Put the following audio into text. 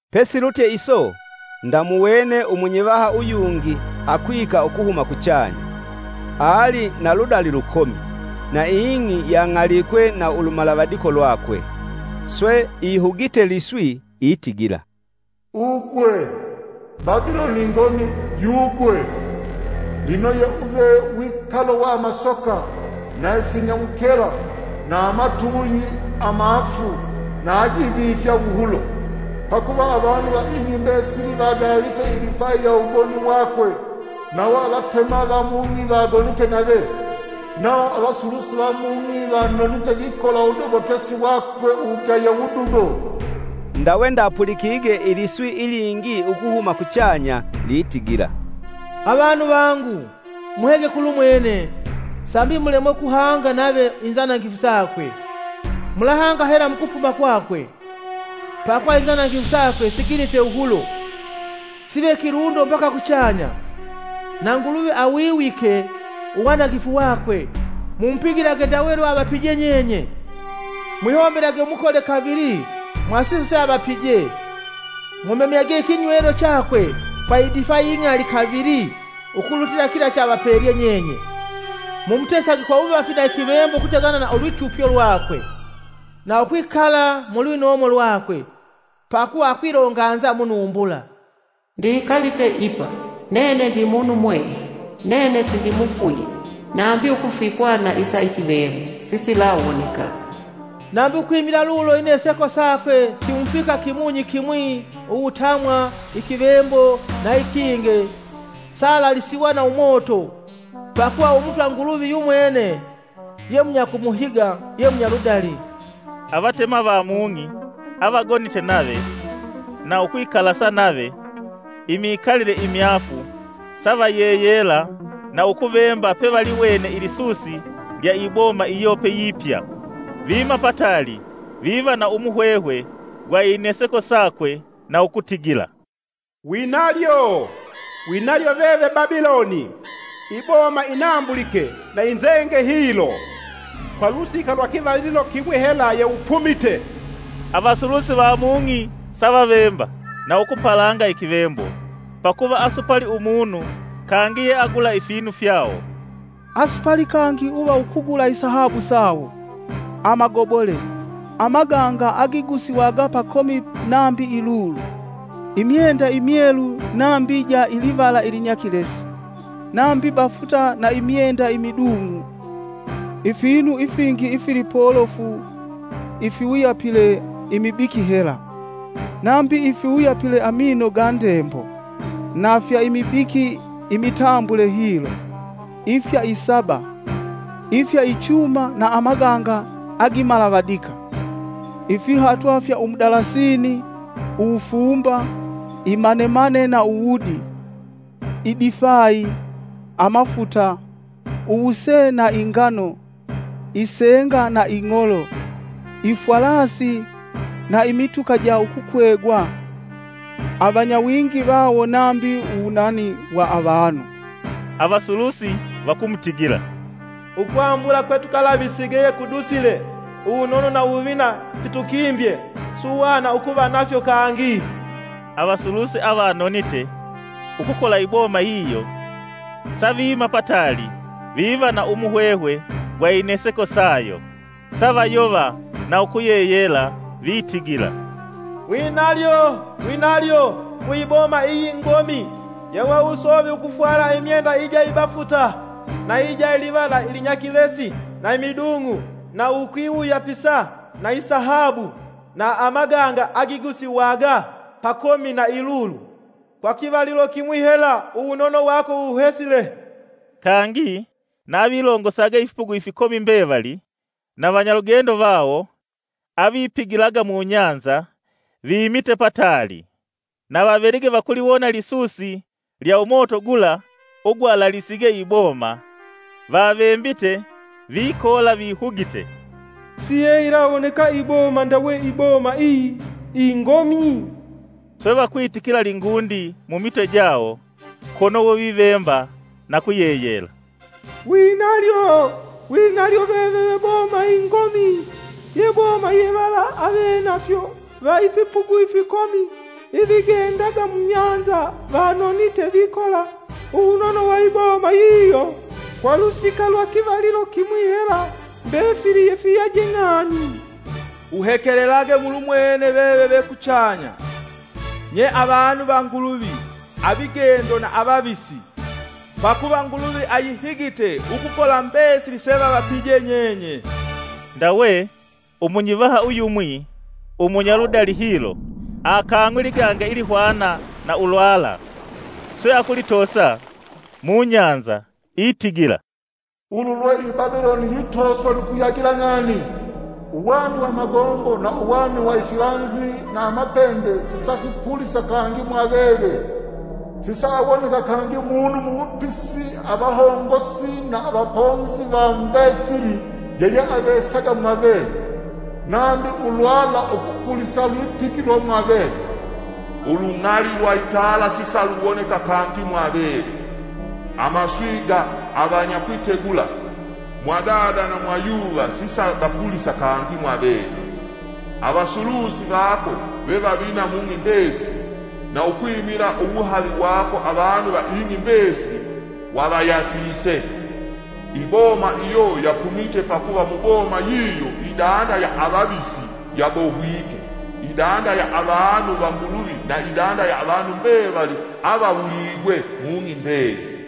Pesilutye iso, ndamuwene umunyivaha uyungi akwika ukuhuma kuchanya. Ali na ludali lukomi, na ing'i yang'alikwe na ulumalavadiko lwakwe. Swe, ihugite liswi itigila, “Ugwe; Babiloni ingomi yugwe! Lino yeuve wikalo wa amasoka; na finyamukela na amatuuyi amaafu na agifivifya wuhulo. Pakuva avanu va ing'i mbesili vagalite idifai ya uwugoni wakwe, nawo avatema va mung'i vagonite nave. Nawo avasulusi va mung'i vanonite vikola uwudobokesi wakwe uwugaya wudugo.” Ndawe ndapulikige iliswi ilingi ukuhuma kuchanya litigila, “Avanu vangu, muhege kulumwene, sambi mulemwe ukuhanga nave inzanangifu sakwe, mulahanga hela mukupuma kwakwe. Pakuva inzanangifu sakwe siginite wuhulo, sive kilundo mbaka kuchanya, na Nguluvi awiwike uwanangifu wakwe. Mumupigilage ndawe lweavapije nyenye; Mwihombelage umukole kavili mwasiso seavapije. Mumemyage ikinywelo chakwe kwa idifai ing'ali kavili ukulutila kila cheavapelye nyenye. Mumutesage kwa wuvafi na ikivembo ukutegana na ulwitupyo lwakwe, na ukwikala mulwinomo lwakwe. Pakuva akwilonganza munumbula: ‘Ndikalite ipa; nene ndi munumwehe. Nene sindimufwile, nambi ukufikwa na isa ikivembo sikilawoneka!’ Nambi ukwimila lulo ineseko sakwe simufika kimunyi kimwi! uwutamwa, ikivembo, na ikinge. saalalisiwa na umoto, pakuva Umutwa Nguluvi yumwene yemunyakumuhiga ye munyaludali.” Avatema va mung'i avagonite nave na ukwikalasa nave imikalile imyaafu savayeyela na ukuvemba pevaliwene ilisusi lya iboma iyo peyipya. Viima pataali viva na umuhwehwe gwa ineseko sakwe na ukutigila, “Winalyo! Winalyo veve Babiloni, iboma inambulike na inzenge hilo! Kwa lusika lwa kivalilo kimwi hela yeupumite.” Avasulusi va mung'i savavemba na ukupalanga ikivembo, pakuva asupali umunu kangi yeagula ifinu fyawo; asupali kangi uva ukugula isahabu sawo, amagobole, amaganga agigusiwaga pakomi nambi ilulu, imyenda imyelu nambi ja ilivala ilinyakilesi, nambi bafuta na imyenda imidung'u, ifinu ifingi ifilipolofu ifiwuyapile imibiki hela, nambi ifiwuyapile amino ga Ndembo, na fya imibiki imitambule hilo, ifya isaba, ifya ichuma na amaganga agimalavadika, ifihatwa fya umudalasini, uwufumba, imanemane na uwudi, idifai, amafuta, uwuse na ingano, isenga na ing'olo, ifwalasi na imituka ja ukukwegwa, avanyawingi vawo nambi uwunani wa avanu. Avasulusi vakumutigila; “Ukwambula kwetukalavisige yekudusile, uwunono na uwuvina fitukimbye; suhwana ukuva nafyo kangi!” Avasulusi avanonite ukukola iboma yiyo, saviima pataali viva na muhwehwe gwa ineseko sayo, savayova na ukuyeyela, vitigila, “Winalyo! Winalyo ku iboma iyi ingomi. Yeweusovye ukufwala imyenda ija ibafuta, na ija livala ilinyakilesi na imidung'u na ukwiwuyapisa na isahabu, na amaganga agigusiwaga pakomi na ilulu!. Kwa kivalilo kimwi hela uwunono wako wuhesile!” Kangi na avilongosaga ifipugu ifikomi mbevali na vanyalugendo vawo, avipigilaga mubahali, viimite pataali, na vavelige vakuliwona lisusi lya umoto gula ugwalalisige iboma, vavembite vikoola vihugite, “Siyeyilawoneka iboma ndawe iboma iyi, ingomi!” Swe vakwitikila lingundi mumitwe jawo kono we vivemba na kuyeyela; “Winalyo! Winalyo veve ve boma ingomi! Ye boma ye vala avenafyo va ifipugu ifikomi ifigendaga mubahali vanonite vikola uwunono wa iboma yiyo. Kwa lusika lwa kivalilo kimwi hela mbefili yefiyaje ng'ani!” Uhekelelage mulumwene veve ve kuchanya. Nye avanu va Nguluvi, avigendo na avavisi, pakuva Nguluvi ayihigite ukukola mbesili sevavapije nyenye! Ndawe umunyivaha uyumwi umunyaludali hilo aakang'we liganga ilihwana na ulwala, swe akulitoosa mubahali itigila, “Ulu lwe i Babiloni yitooswa nu kuyagila ng'ani, uwani wa magombo, na uwani wa ifilanzi na amapembe sisafipulisa kangi mwaveve. Sisaawoneka kangi munu muwupisi avahongosi na avaponzi va mbefili yeyeavesaga mwaveve, nambi ulwala ukupulisa lwipigilwa mwaveve. Ulung'ali lwa itala sisaluwoneka kangi mwaveve; amaswi ga avanyakwitegula, mwadada na mwayuva sisagapulisa kangi mwaveve. Avasulusi vako ve vavina mung'i mbesili, na ukwimila uwuhavi wako avanu va ing'i mbesili wavayasise!” Iboma iyo yapumite pakuva muboma yiyo idanda ya avavisi yabohwike, idanda ya avanu va Nguluvi na idanda ya avanu mbevali avawuligwe mung'i mbeyili.